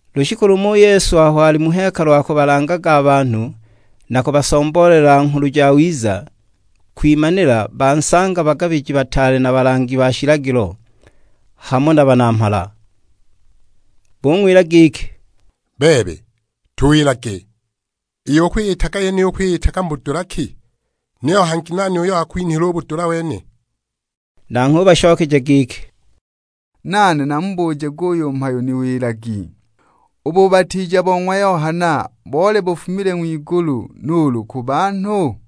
Lushiku lumo u Yesu aho ali mu hekalu akubalangaga a banhu na kubasomboolela Nghulu Jawiza, kwimanila bansanga bagabiji bataale na balangi ba shilagilo, hamo na banamhala. Bung'wila giki, "Bebe, tuwilage, iyo ukwiyitaga yeniyi ukwiyitaga mu budula ki, niyo hangi nani uyo wakwinhile u budula wene?" Nanghwe ubashokeja giki, "Nane namubuje guyu mhayo niwilagi. U bubatiija bo ng'wa Yohana boli bufumile ng'wigulu, nuulu ku banhu?"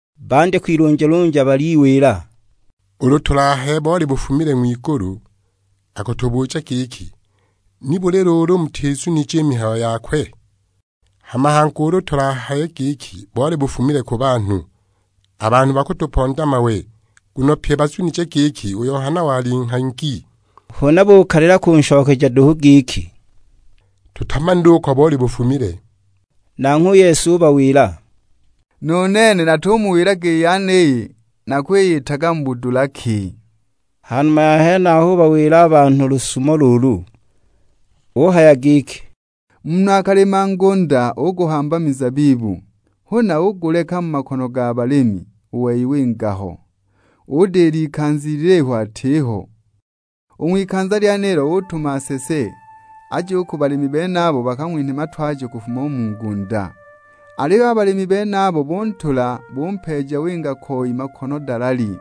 Bandya kwilunjalunja baliwila, "Ulu tulahaye boli bufumile ng'wigulu, akutubuja giki, 'Nibuli luulu mutizunije i mihayo yakwe?' Hama hangi ulu tulahaye giki, 'Boli bufumile ku banhu,' a banhu bakutuponda mawe; nguno pye bazunije giki u Yohana wali nghangi." Huna bukalila kunshokeja duhu giki, "Tutamanile uko boli bufumile!" Nanghwe u Yesu ubawila, "Nu nene natumuwilaga i yeniyi nakwiyitaga mu budula ki." Ha numa ya henaho ubawila a banhu lusumo luulu; uhaya giki, "Munhu akalima ngunda uguhamba mizabibu. Huna uguleka mu makono ga balimi; u wei winga ho, udila ikanza ilihu atiho. U ng'wikanza lyenilo utuma nsese, aje u ku balimi benabo bakang'winhe matwajo kufuma u mu ngunda. Aliyo a balimi benabo buntula, bumpeeja winga koi makono dalali.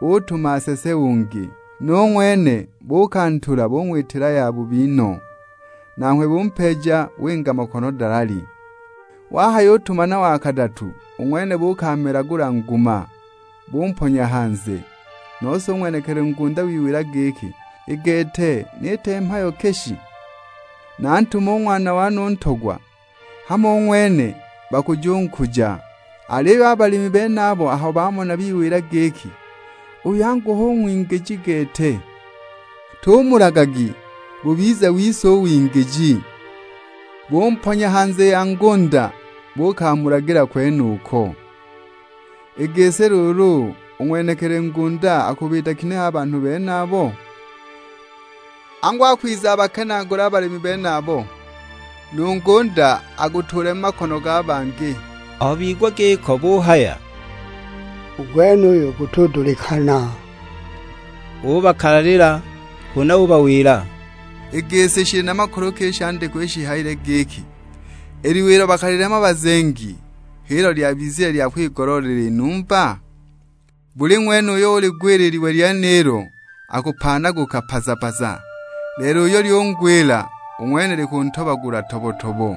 Utuma nsese ungi, nu ng'wene buukantula bung'witila yabubi no; nanghwe bumpeeja winga makono dalali. Wahayutuma na wa kadatu, u ng'wene buukamelagula nguma, bumponya hanze. Nose u ng'wenekili ngunda wiwila giki, 'I gete niite mhayo ki shi? Nantume u ng'wana wane u ntogwa, hamo u ng'wene bakujunkuja!' Aliyo a balimi benabo aho bamona biwila giki, 'Uyu angu hu ng'wingiji gete, tumulagagi bubize wise u wingiji!' Bumponya hanze ya ngunda buukamulagila kwenuko! I gisi luulu u ng'wenekili ngunda akubiita ginehe a banhu benabo? Angu akwiza abakenaagule a balimi benabo, nu ngunda agutuule mu makono ga bangi!" Aho bigwa giko buhaya, "U gwenuyu gutudulikana!" Ubakalalila; huna ubawila, "I gisi shili na makulu ki i shandikwa isho shihayile giki, 'I liwe ilo bakalilema bazengi, h'ilo lyabizile lya kwigoloolela i numba? Buli ng'wene uyo uligwila i liwe lyenilo akupaanaguka paza-paza; lelo uyo lyungwila, u ng'wene likuntobagula tobo-tobo!' "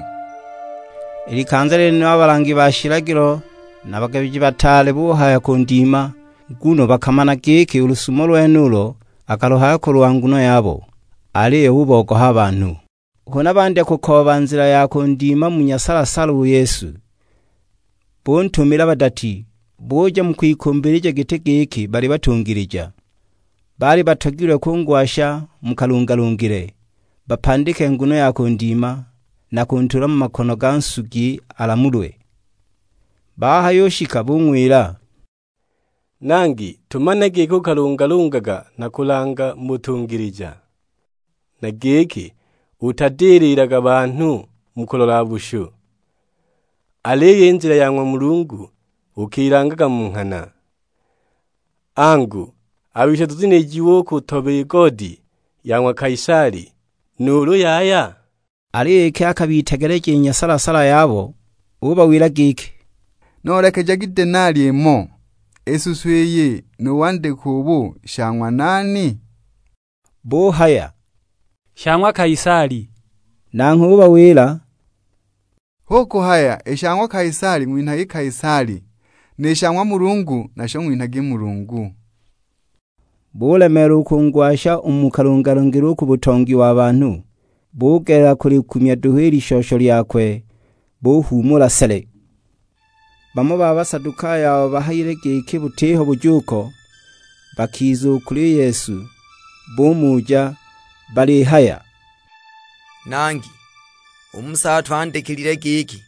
I likanza lyenilo, a balangi ba shilagilo na a bagabiji bataale buhaya kundima, nguno bakamana giki u lusumo lwenulo akaluhaya kulwa nguno yabo; aliyo bubogoha a banhu! Huna bandya kukooba nzila ya kundima mu nyasala-sala u Yesu; buntumila badati, buja mu kwigimbija giti giki bali batungilija. Baali batogilwe kungwasha mu kalungalungile, bapandike nguno ya kundima, na kuntuula mu makono ga nsugi alamulwe. Bahayushika bung'wila, "Nangi, tumanile giki ukalungalungaga na kulanga mu butungilija, na giki utadililaga banhu mu kulola bushu, aliyo i nzila ya ng'wa Mulungu ukilangaga mu nghana. Angu, a bise tuzunilijiwe u kutoba i goodi ya ng'wa Kaisali, nuulu yaya?" Aliyo iki akabitegeleja i nyasala-sala yabo, ubawila giki; "Noolekejagi denali imo. I suso iyi nu wandike ubu, sha ng'wa nani?" Buhaya, "Sha ng'wa Kaisali." Nanghwe ubawila, "Hu kuhaya i sha ng'wa Kaisali ng'winhagi Kaisali, ni sha ng'wa Mulungu nasho ng'winhagi Mulungu." Bulemeelwa u kungwasha u mu kalungalungile u ku butongi wa banhu, bugelela kulikumya duhu i lishosho lyakwe, buhuumula sele! Bamo ba Basadukayo abo bahayile giki butiho bujuuko, bakiza u kuli Yesu; bumuja balihaya, "Nangi, u Musa atwandikilile giki,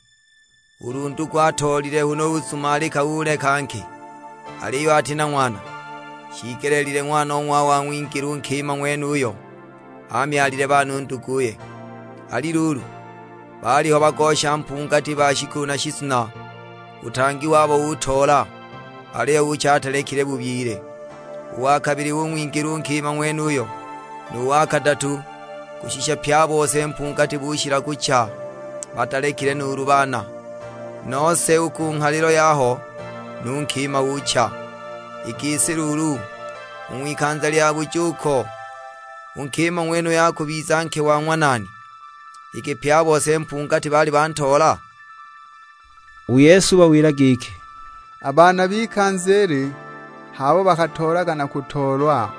ulu ndugu atoolile huna uzumalika uleka nke, aliyo ati na ng'wana, shiigelile ng'wanong'wawe ang'wingile u nkima ng'wenuyo amyalile baana u nduguye. Ali luulu, baaliho bagosha mpungati ba shikulu na shizuna; u tang@i wabo utoola, aliyo ucha atalekile bubyile. U wa kabili ung'wingila u nkima ng'wenuyo, nu wa kadatu; kushisha pye a bose mpungati bushila kucha batalekile nuulu baana! Nose u ku nghalilo yaho nu nkima ucha. I gisi luulu, u ng'wikanza lya bujuuko, u nkima ng'wenuyo akubiza nke wa ng'wa nani; iki pye a bose mpungati baali bantoola?" U Yesu ubawila giki, "A baana b'ikanza ili h'abo bakatoolaga na kutoolwa.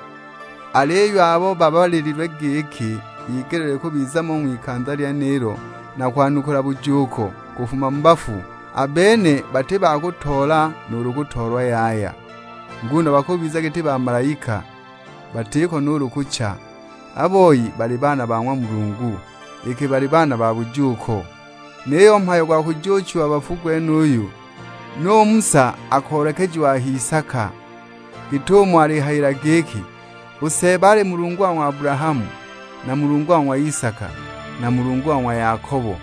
Aliyo abo babalilwe giki bigeleelilwe kubiza mo u ng'wikanza lyenilo na kwanukula bujuuko kufuma mu bafu, a bene bati ba kuyutoola nuulu kutoolwa yaya. Nguno bakubiza giti bamalaika, batiko nuulu kucha; a boi bali baana ba ng'wa Mulungu, iki bali baana ba bujuuko. Niyo u mhayo gwa kujuuchiwa bafu gwenuyu, nu Musa akoolekejiwa a h'isaka; git'umo alihayila giki, 'U Seeba ali Mulungu wa ng'wa Abulahamu, na Mulungu wa ng'wa Isaka, na Mulungu wa ng'wa Yakobo.'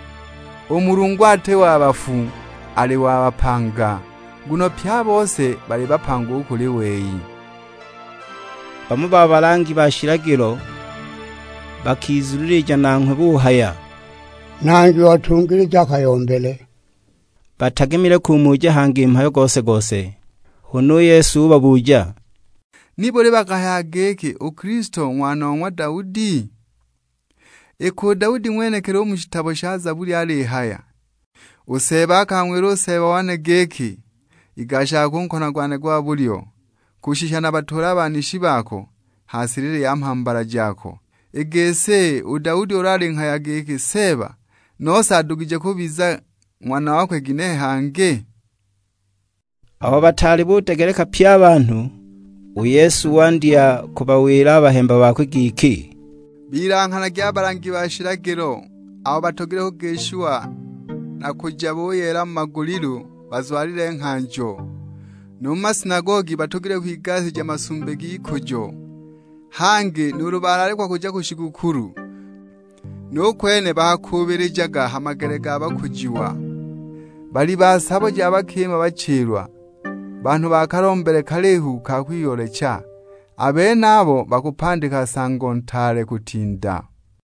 U Mulungu ati wa bafu, ali wa bapanga; nguno pye a bose bali bapanga u kuli wei." Bamo ba balangi ba shilagilo bakizunilija nanghwe buhaya, "Nangi watungilija a kayombele." Batagemile kumuja hangi mhayo gose-gose. Huna u Yesu ubabuja, "Nibuli bakahayaga giki u Kilisto ng'wana o ng'wa Daudi? Iki u Daudi ng'wenekili u mu shitabo sha Zabuli alihaya, 'U Seeba akang'wila u Seeba wane giki: Igashaga ku nkono gwane gwa bulyo, kushisha nabatuule a banishi bako ha silili ya mhambala jako.' I gisi, u Daudi ulu alinghaya giki 'Seeba,' nose adugije kubiza ng'wana wakwe ginehe hangi?" Aho bataali budegeleka pye a banhu, u Yesu wandya kubawila a bahemba bakwe giki, "Bilanghanagi a balangi ba shilagilo abo batogilwe kugishiwa na kuja buyeela mu magulilu bazwalile nghanjo. Nu mu masinagogi batogilwe kwigasija masumbi g'ikujo; hangi nuulu bulaalikwa kuja ku shigukulu, nu kwene bakakuubilijaga ha magele ga bakujiwa. Balyi ba sabo ja bakima bachilwa, banhu ba kalombele kalihu ka kwiyoolecha. A benabo bakupandika nsango ntaale kutinda!"